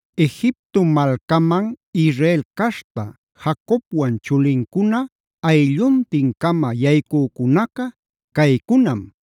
Egipto malcaman Israel caśhta Jacobwan chulincuna aylluntin-cama yaycücunaca caycunam: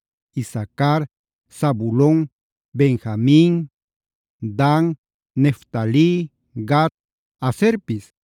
Isacar, Zabulon, Benjamin, Dan, Neftali, Gad, Aserpis.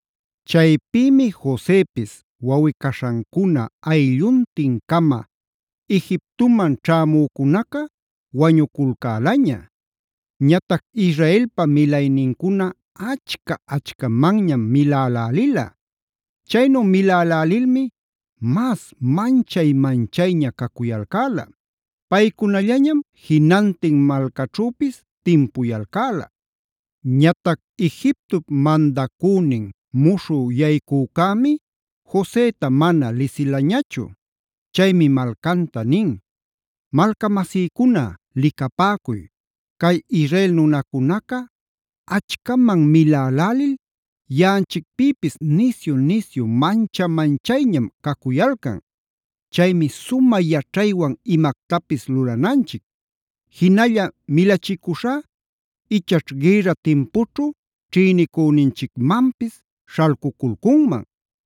Chaypïmi Josepis, wawꞌi-caśhancuna aylluntin-cama Egiptoman ćhämücunaca wañuculcäläña. Ñatac Israelpa milaynincuna achca-achcamanñam milälälila. Chaynu milälälilmi mas manchay-manchayña cacuyalcäla. Paycunallañam jinantin malcaćhüpis timpuyalcäla. Ñatac Egiptop mandacünin muśhü yaycücämi Joseta mana lisilañachu. Chaymi malcanta nin: “Malcamasïcuna licapäcuy, cay Israel nunacunaca achcaman milälälil yaꞌanchicpïpis nisyu-nisyu mancha-manchayñam cacuyalcan. Chaymi sumä yaćhaywan imactapis lulananchic. Jinalla milachicuśhá ichaćh gïrra timpućhu ćhïnicüninchicmanpis śhalcuculcunman;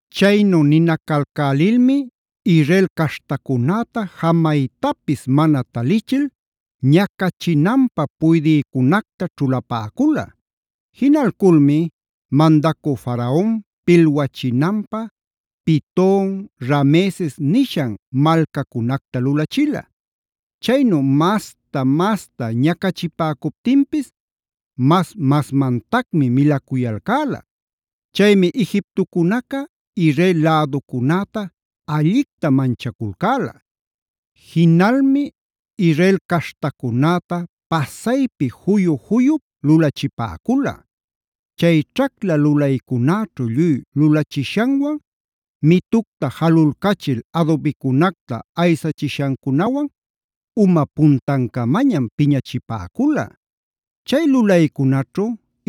Chaynu ninacalcälilmi Israel caśhtacunäta jamaytapis mana talichil ñacachinanpä puydïcunacta ćhulapäcula. Jinalculmi mandacü Faraon pilwachinanpä Piton, Rameses nishan malcacunacta lulachila. Chaynu masta-masta ñacachipäcuptinpis mas-masmantacmi milacuyalcäla. Chaymi Egiptocunaca Israel läducunäta allicta manchaculcäla. Jinalmi Israel caśhtacunäta pasaypi juyu-juyup lulachipäcula. Chay ćhacla lulaycunäćhu lluy lulachishanwan, mitucta jalulcachil adubicunacta aysachishancunawan uma puntancamañam piñachipäcula. Chay lulaycunaćhu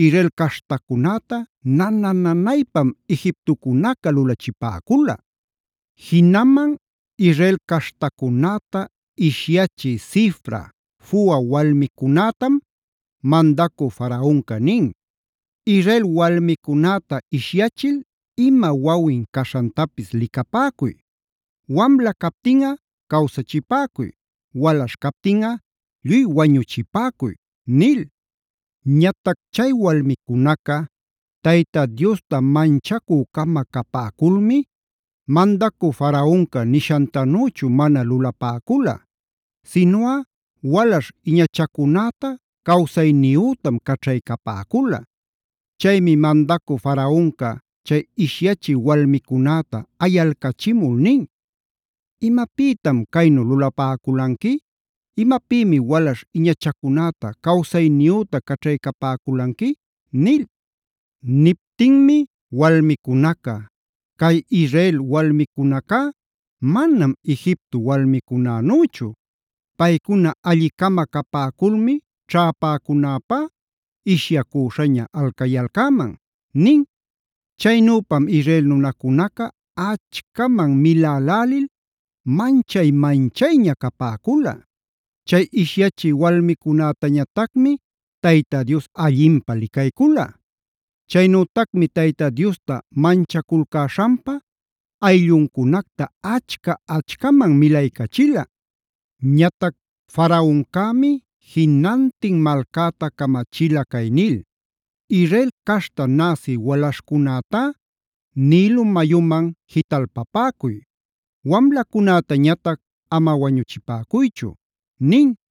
Israel caśhtacunäta nana-nanaypam Egiptocunaca lulachipäcula. Jinaman Israel caśhtacunäta ishyachï Sifra, Fua walmicunätam mandacü Faraonca nin: “Israel walmicunäta ishyachil ima wawin caśhantapis licapäcuy. Wamla captinꞌa cawsachipäcuy; walaśh captinꞌa lluy wañuchipäcuy” nil. Ñatac chay walmicunaca Tayta Diosta manchacü-cama capäculmi mandacü Faraonca nishantanüchu mana lulapäcula. Sinuꞌa walaśh iñachacunäta cawsayniyütam caćhaycapäcula. Chaymi mandacü Faraonca chay ishyachï walmicunäta ayalcachimul nin: “¿Imapïtam caynu lulapäculanqui? ¿Imapïmi walaśh iñachacunäta cawsayniyüta caćhaycapäculanqui?” nil. Niptinmi walmicunaca: “Cay Israel walmicunacá manam Egipto walmicunanüchu. Paycuna alli-cama capäculmi ćhäpäcunäpá ishyacüśhaña alcayalcäman” nin. Chaynüpam Israel nunacunaca achcaman milälälil manchay-manchayña capäcula. Chay ishyachï walmicunätañatacmi Tayta Dios allinpä licaycula. Chaynütacmi Tayta Diosta manchaculcäśhanpa aylluncunacta achca-achcaman milaycachila. Ñatac Faraoncämi jinantin malcäta camachila cay nil: “Israel caśhta näsi walaśhcunätá Nilo mayuman jitalpapäcuy;c wamlacunätañatac ama wañuchipäcuychu” nin.